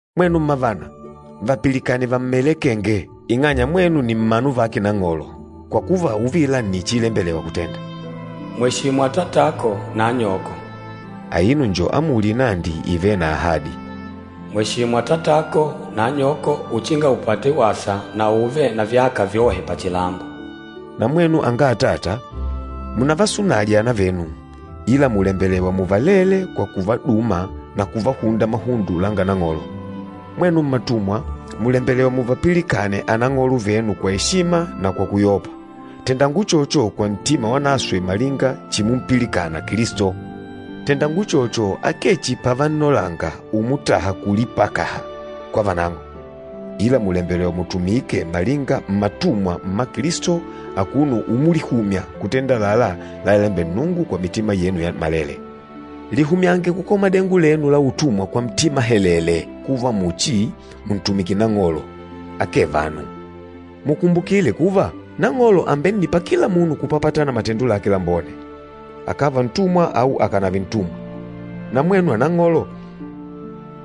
Mwenu mmavana, vapilikane vammelekenge, ing'anya mwenu ni mmanu vake Nang'olo, kwa kuva uvila nni chiilembelewa kutenda. “Mweshimu atatako na anyoko.” Aino njo amuli inandi ivêle na ahadi, “Mweshimu atatako na anyoko uchinga upate wasa na ùùve na vyaka vyohe pachilambo.” Na mwenu anga atata, munavasunaje anavenu, ila mùlembelewa muvalele kwa kuvaduma na kuvahunda mahundo langa Nang'olo. Mwenu mmatumwa, mùlembelewa muvapilikane anang'olo venu kwa eshima na kwa kuyopa. Tendanga uchocho kwa ntima wanaswe malinga chimumpilikana Kilisto. Tendanga uchocho akee chihi pavannolanga umutaha kulipakaha kwa vanang'o, ila mùlembelewa mutumike malinga mmatumwa mma Kilisto akuno umulihumya kutenda àlalá lalalembela Nnungu kwa mitima yenu yammalele. Lihumyange kukola madengo lenu la utumwa kwa ntima helele kuva muchi muntumikila Nang'olo, akee vanu. Mukumbukile kuva, Nang'olo àmbennipa kila munu kupapatana na matendo lake lambone, akàva ntumwa au akànave ntumwa. Na mwenu anang'olo,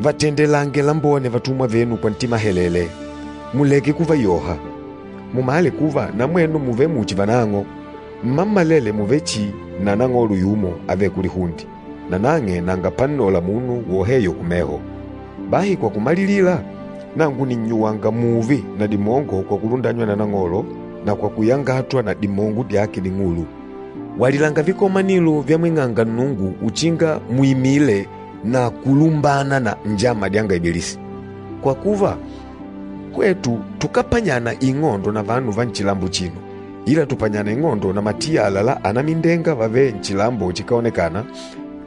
vatendelange lambone vatumwa venu kwa ntima helele, muleke kuvayoha. Mumale kuva na mwenu mùvele muchi vanang'o, mmammalele mùvele chihi na Nang'olo yumo avêle kulihunde, nanang'e nanga pannola munu woheyo kumeho. Bahi kwa kumalilila, nangu nìnnyuwanga mùùve na dimongo kwa kulundanywa na Nang'olo na kwa kuyangatwa na dimongo dyake ding'ulu. Walilanga vikomanilo vyamwing'anga Nnungu uchinga muimile na kulumbana na njama dyanga Ibilisi. Kwa kuva, hwetu tukápanyana ing'ondo na vanu va nchilambo achino, ila tùpanyana ing'ondo na matiyala la anamindenga vavêle nchilambo chikáonekana,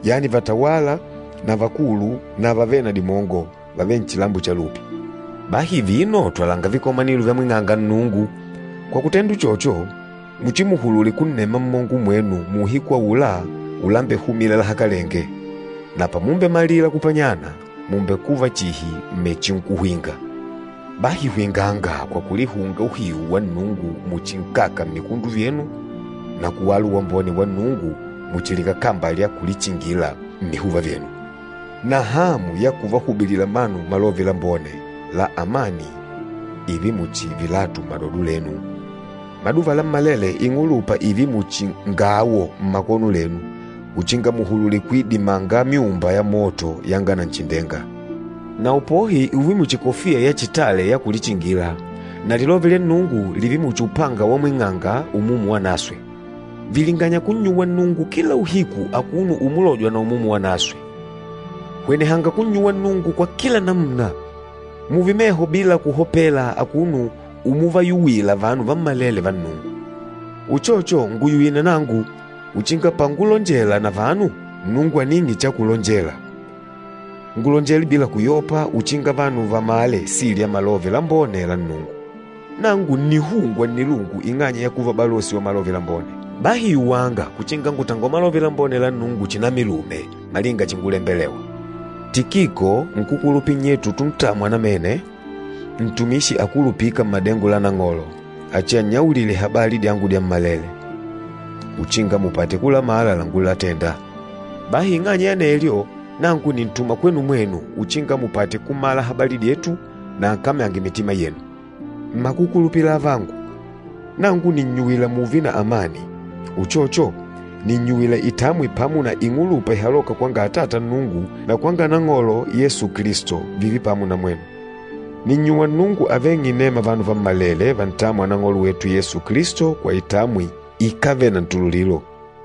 yani vatawâla na vakulu na vavêle na dimongo, vavêle nchilambo cha lupi. Bahi vino twalanga vikomanilo vyamwing'anga Nnungu. Kwa kutenda uchocho, muchimuhulule kunnema mmongo mwenu muuhiku aula ulambehumila lahakalenge. Na pamumbemalila kupanyana, mùmbekuva chihi mmechinkuhwinga. Bahi hwinganga kwa kulihunga uhiu wa Nnungu muchi nkaka mmikundu vyenu na kuwala uwambone wa Nnungu muchi likakamba lya kulichingila mmihuva vyenu, na hamu ya kuvahubilila vanu Malove Lambone la amani ììve muchi vilatu mmadodo lenu. Maduva lammalele, ing'ulupa ììve muchi ngawo mmakono lenu, uchinga muhulule kuidimanga myumba ya moto yanga Nanchindenga. Na upohi ùùve muchi kofiya ya kulichingila, na lilove lya Nnungu lììve muchi upanga wamwing'anga Umumu Wanaswe. Vilinganya kunnyuwa Nnungu kila uhiku akuno umulojwa na Umumu Wanaswe. Hwenehanga kunnyuwa Nnungu kwa kila namuna. Mùùve meho bila kuhopela akuno umuvayuwila vanu vammalele va Nnungu. Uchocho, nguyuwile na nangu, uchinga pangulonjela na vanu, Nnungu aning'e cha kulonjela, ngulonjele bila kuyopa uchinga vanu vamale sili ya Malove Lambone la Nnungu. Nangu ǹnihungwa nnilungu ing'anya ya kuva balosi wa Malove Lambone. Bahi yuwanga uchinga ngutangole Malove Lambone la Nnungu chinamilume malinga chingulembelewa. Tikiko, nkúkulupila nnyetu utuntamwa namene, ntumishi akulupîka mmadengo la Nang'olo, achiannyaulile habali dyangu dyammalele, uchinga mupate kulamala langulatenda. Bahi ing'anya ya anelyo, nangu nìntuma kwenu mwenu uchinga mupate kumala habali dyetu na ankamyange mitima yenu. Mmakukulupila avangu, nangu nìnnyuwila mùùve na amani. Uchocho, nìnnyuwila itamwi pamo na ing'ulupa ìhaloka kwanga Atata Nnungu na kwanga Nang'olo Yesu Kilisto, vììve pamo na mwenu. Nìnnyuwa Nnungu aveng'e inema vanu vammalele vantâmwa Nang'olo wetu Yesu Kilisto kwa itamwi ikávele na ntululilo.